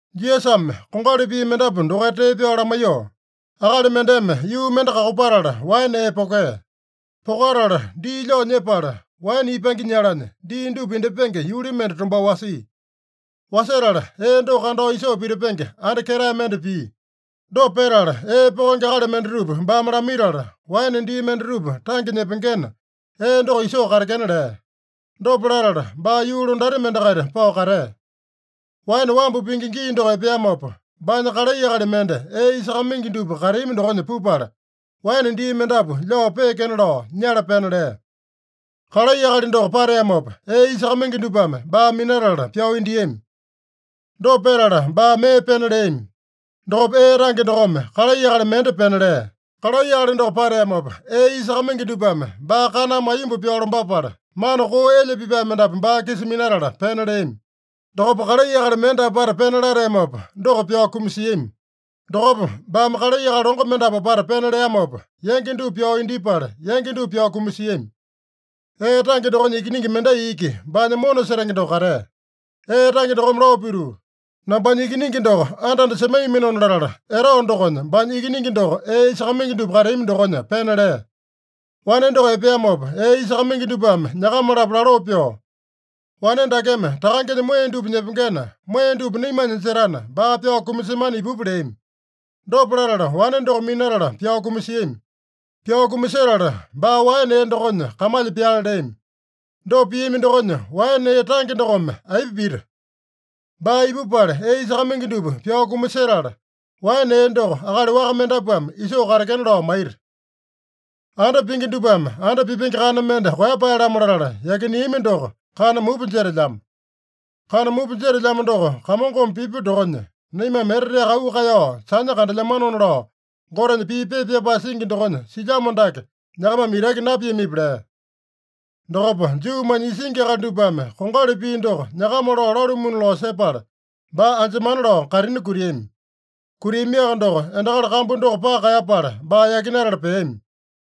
Jisasame kongali pii mendapu dokaita tee pyao lamaiyoo, “Akali mendeme yuu mende kakopatala, waene ee pokea. Pokatala dii lyao nyepala waene ipange nyalanya dii dupa indyepenge yuli mende tombao wasia. Wasetala ee doko kandao isoo pitipenge anda ketae mende pia. Dopa petala ee pokenge akali mendatupa baame lamaitala, waene dii mendatupa tange nyepengena, ee doko isoo katekena lea. Dopa latala baa yuu londati mendakaita pao katea. Waene wambu pingi gii doko epeamopa, baanya kalai akali mende ee isakamaingi dupa kateami dokonya pupala, waene dii mendapu lyao peekena lao nyala pena lea. Kalai akali doko pateamopa, ee isakamaingi dupame baa minatala pyao indiami. Dopa petala baa mee pena leami. Dokopa ee tange dokome kalai akali mende pena lea. Kalai akali doko pateamopa, ee isakamaingi dupame baa kaname aiyomba pyao lombapala, mana koo elya pipae mendapu baa-kisa minatala pena leami. Dokopa kalai akali mende apata pena lateamopa, doko pyao kumasiami. Dokopa baame kalai akali longo mendapu apata pena leamopa, yangi dupa pyao indyepala, yangi dupa pyao kumasiami. Ee tange dokonya ikiningi mendai iki, baanya mona setenge doko katea. Ee tange dokome lao pituu, ‘Nambanya ikiningi doko anda-anda semaiyaminona’ latala, etao dokonya baanya ikiningi doko ee isakamaingi dupa kateami dokonya pena lea. Wane doko epeamopa, ee isakamaingi dupame nyakama-lapo laloo pyoo, ‘Wane dakeme takangenya moeya dupa nyepengena, moeya dupa naimanya jetana, baa pyao kumasemana ipupa’ leami. Dopa latala, wane doko minatala pyao kumasiami. Pyao kumasetala, baa waene ee dokonya kamalya pyale leami. Dopa piami dokonya, waene ee tange dokome aipa pita? Baa ipupala, ee isakamaingi dupa pyao kumasetala, waene ee doko akali waka mendapuame isoo katekena lao maita. ‘Anda pingi dupame anda pipenge kana mende koeyapae-lamo latala yakineami doko kana mupa jetelyamo. Kana mupa jetelyamo doko Kamongome pipya dokonya, naimame eteteaka auu kaeyao sanya kandelyamanona’ lao Gotenya pii pepa pyapae singi dokonya silyamo dake nyakamame itaki napiamipi?” lea. Dokopa Juumanya isingi akali dupame kongali pii doko nyakama lao lalumuna lao sepala, baa anjemana lao kaitini kutiami. Kutiamiaka doko, endakali kambu doko paka kaeyapala, baa yakinatala peami.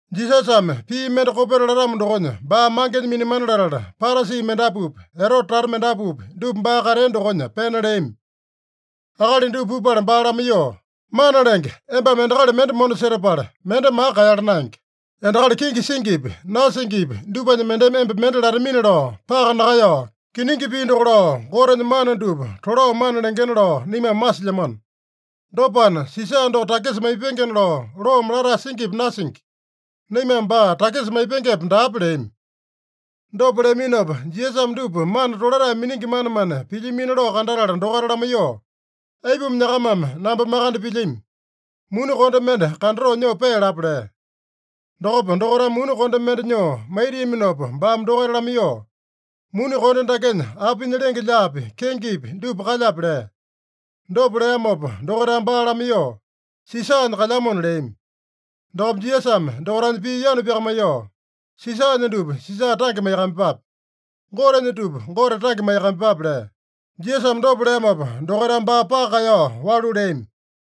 Jisasame pii mende kopeta latamo dokonya baa mangenya minamana latala, Parasi mendapupi, Erote tata mendapupi, dupa baa katea dokonya pena leami. Akali dupa pupala baa lamaiyoo, “Mana Lenge, embame endakali mende mona setapala, mende maka kaeyala naenge. Endakali kenge singipi, nasingipi dupanya mendeme emba mende latamini-lao paka nakaeyao, kiningi pii doko lao, Gotenya mana dupa tolao mana lengena lao naimame masilyamano. Dopana, Sisa doko takisa maipengena lao loome latae singipi nasingi? Naimame baa takisa maipengepe, daape?” leami. Dopa leaminopa, Jisasame dupa mana tolatae miningi manemane pilyamino lao kandatala dokaita lamaiyoo, “Aipuma nyakamame namba makande pilyami? Muni konde mende kandatoo, nyoo pealapa” lea. Dokopa dokaitame muni konde mende nyoo maitiaminopa, baame dokaita lamaiyoo, “Muni konde dakenya apinya lenge-lyaapi, kengepi dupa kalyape?” lea. Dopa leamopa dokaitame baa lamaiyoo, “Sisanya kalyamona” leami. Dokopa Jisasame dokaitanya pii yanu pyakamaiyoo, “Sisanya dupa Sisa tange maiyakamaiyepape. Gotenya dupa Gote tange maiyakamaiyepape” lea. Jisasame dopa leamopa dokaitame baa paka kaeyao walu leami.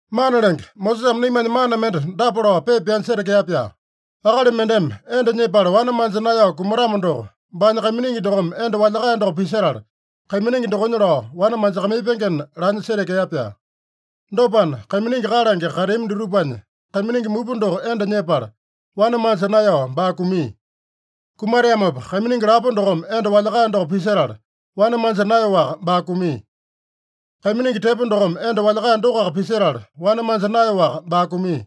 “Mana Lenge, Mosesame naimanya mana mende dapa lao pepa pyanya setekea-pyaa: ‘Akali mendeme enda nyepala wane manja naeyao kumatamo doko, baanya kaiminingi dokome enda walyakae doko pisetala, kaiminingi dokonya lao wane manjakamaipengena’ laanya setekea-pyaa. Dopana, kaiminingi kalange kateami dutupanya kaiminingi mupa doko enda nyepala, wane manja naeyao baa kumia. Kumateamopa kaiminingi lapo dokome enda walyakae doko pisetala, wane manja naeyaowaka baa kumia. Kaiminingi tepo dokome enda walyakae dokoaka pisetala, wane manja naeyaowaka baa kumia.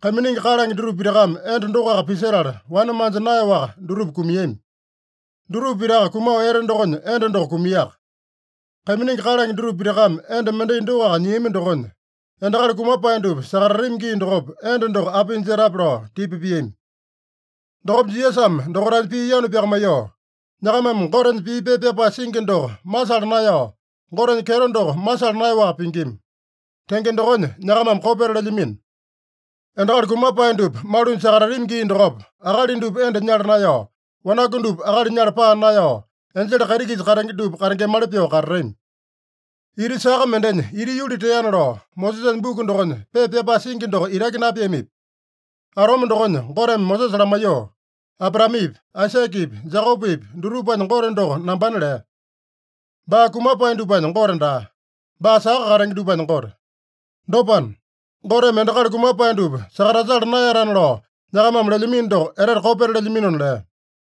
Kaiminingi kalange dutupa pitakame enda dokoaka pisetala, wane manja naeyaowaka dutupa kumiami. Dutupa pitaka kumao ete dokonya enda doko kumiaka. Kaiminingi kalange dutupa pitakame enda mendai dokoaka nyiami dokonya, endakali kumapae dupa sakatatami gii dokopa enda doko apinya jetape?” lao tipa piami. Dokopa Jisasame dokaitanya pii yanu pyakamaiyoo, “Nyakamame Gotenya pii pepa pyapae singi doko masala naeyao, Gotenya kyeto doko masala naeyaowaka pingima. Tenge dokonya nyakamame kopeta lelyamino. Endakali kumapae dupa malunya sakatatami gii dokopa, akali dupa enda nyala naeyao, wanaku dupa akali nyala paa naeyao, enjele kaiti-kisa katenge dupa katengemali pyoo katatami. Ita saka mendenya ita yuli teana lao Mosesanya buku dokonya pepa pyapae singi doko itaki napiamipi? Atome dokonya Goteme Mosesa lamaiyoo, ‘Abraamepi, Aisakepi, Jekopepi dutupanya Gote doko nambana’ lea. Baa kumapae dupanya Gote daa. Baa saka katenge dupanya Gote. Dopana, Goteme endakali kumapae dupa sakatasala naeyatana lao nyakamame lelyamino doko etete kopeta lelyaminona” lea.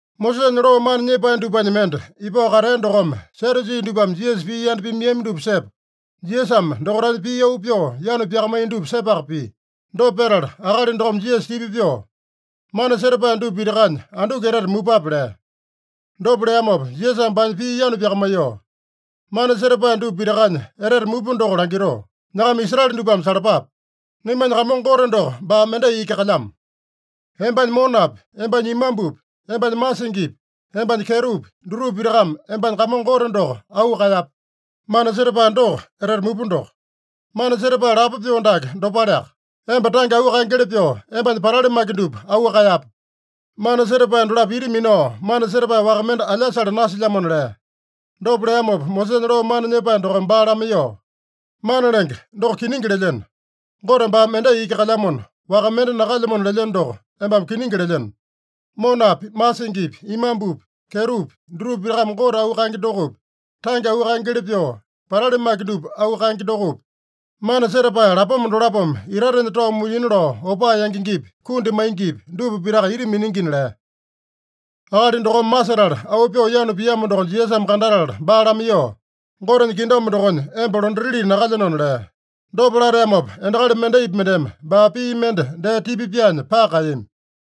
Mosesanya loo mana nyepae dupanya mende ipao katea dokome Sadyusi dupame Jisasa pii yanda pimaiyami dupa sepa, Jisasame dokaitanya pii auu pyoo yanu pyakamaiya dupa sepaka pia. Dopa petala akali dokome Jisasa tipa pyoo, “Mana setapae dupa pitakanya anduku etete mupape?” lea. Dopa leamopa Jisasame baanya pii yanu pyakamaiyoo, “Mana setapae dupa pitakanya etete mupa doko langitoo: ‘Nyakama Israele dupame salapape! Naimanya Kamongo Gote doko baa mendai iki kalyamo. Embanya monapi, embanya imambupi, embanya masingipi, embanya kyetopi, dutupa pitakame embanya Kamongo Gote doko auu kaeyape.’ Mana setapae doko etete mupa doko. Mana setapae lapo pyoo dake dopaleaka: ‘Emba tange auu kaengeli pyoo, embanya patali maki dupa auu kaeyape.’ Mana setapae dolapo ita minao, mana setapae waka mende alyasale nasilyamona” lea. Dopa leamopa Mosesanya loo mana nyepae dokome baa lamaiyoo, “Mana Lenge, doko kiningi. Gote baa mendai iki kalyamona, waka mende nakalyamona lelyeno doko, embame kiningi lelyeno. Monapi, masingipi, imambupi, kyetopi dutupa pitakame Gote auu kaenge dokopi, tange auu kaengeli pyoo patali maki dupa auu kaenge dokopi, mana setapae lapoma dolapome itatenya tao mulyina lao opaa yangengepi, kundi maingipi, dupa pitaka ita miningina” lea. Akali dokome masetala auu pyoo yanu piamo doko Jisasame kandatala baa lamaiyoo, “Gotenya kingdom dokonya emba londatili nakalyenona” lea. Dopa lateamopa, endakali mendaipi mendeme baa pii mende dee tipa pyaanya paka kaeyami.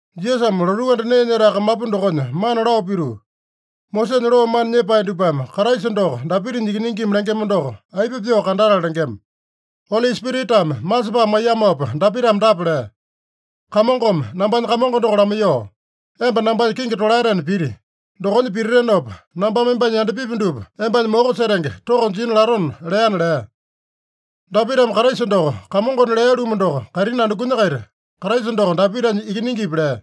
Jisasame lotuu anda nee nyetae kamapu dokonya mana lao pituu, “Mosesanya loo mana nyepae dupame Kraisa doko Dapitanya ikiningina lengema doko, aipa pyoo kandatala lengema? Oli Spiritame masepae maiyamopa Dapitame dapa lea: ‘Kamongome nambanya Kamongo doko lamaiyoo, “Emba nambanya kingi tolaetena piti. Dokonya pititinopa, nambame embanya yandapipi dupa embanya moko setenge toko jina latona” leana’ lea. Dapitame Kraisa doko Kamongona lea-lumu doko, kaitini andukunya-kaita Kraisa doko Dapitanya ikiningipi?” lea.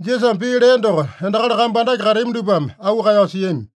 Jisasame pii lea doko endakali kambu andake kateami dupame auu kaeyao siami.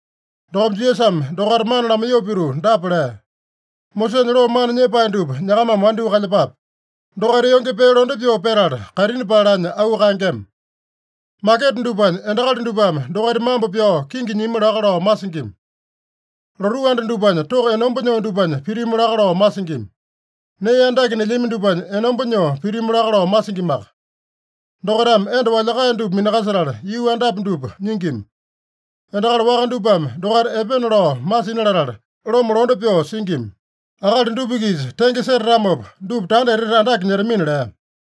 Dokopa Jisasame dokaita mana lamaiyoo pituu dapa lea: “Mosesanya loo mana nyepae dupa nyakamame wandyoo kalyepape. Dokaita yonge pee londe pyoo petala kaitini paeyalanya auu kaengema. Maketa dupanya endakali dupame dokaita mambo pyao kingi nyimi laka lao masingima. Lotuu anda dupanya toko enomba nyoo dupanya pitimu laka lao masingima. Nee andake nelyami dupanya enomba nyoo pitimu laka lao masingimaka. Dokaitame enda walyakae dupa minakasetala, yuu andapi dupa nyingima. Endakali waka dupame dokaita epena lao masina latala, loma londe pyoo singima. Akali dupa-kisa tenge setatamopa, dupa tanda etete andake nyetamina” lea.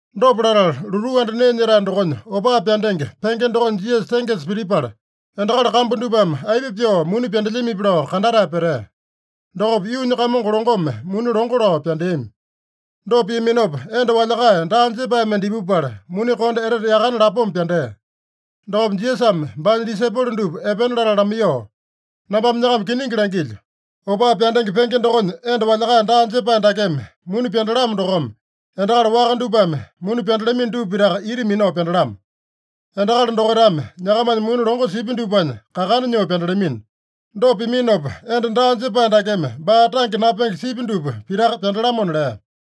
Dopa latala, lotuu anda nee nyetae dokonya opaa pyandenge penge dokonya Jisasa tengesa pitipala, endakali kambu dupame aipa pyoo muni pyandelyamipi lao kandatae petea. Dokopa yuunya kamongo longome muni longo lao pyandeami. Dopa piaminopa, enda walyakae daa jepae mende ipupala, muni konde etete yakane lapoma pyandea. Dokopa Jisasame baanya disaipolo dupa epena latala lamaiyoo, “Nambame nyakama kiningi langilyo: Opaa pyandenge penge dokonya enda walyakae daa jepae dakeme muni pyandalamo dokome, endakali waka dupame muni pyandalamino dupa pitaka ita minao pyandalamo. Endakali dokaitame nyakamanya muni longo sipya dupanya kakana nyoo pyandalamino. Dopa piminopa, enda daa jepae dakeme baa tange napenge sipya dupa pitaka pyandalamona” lea.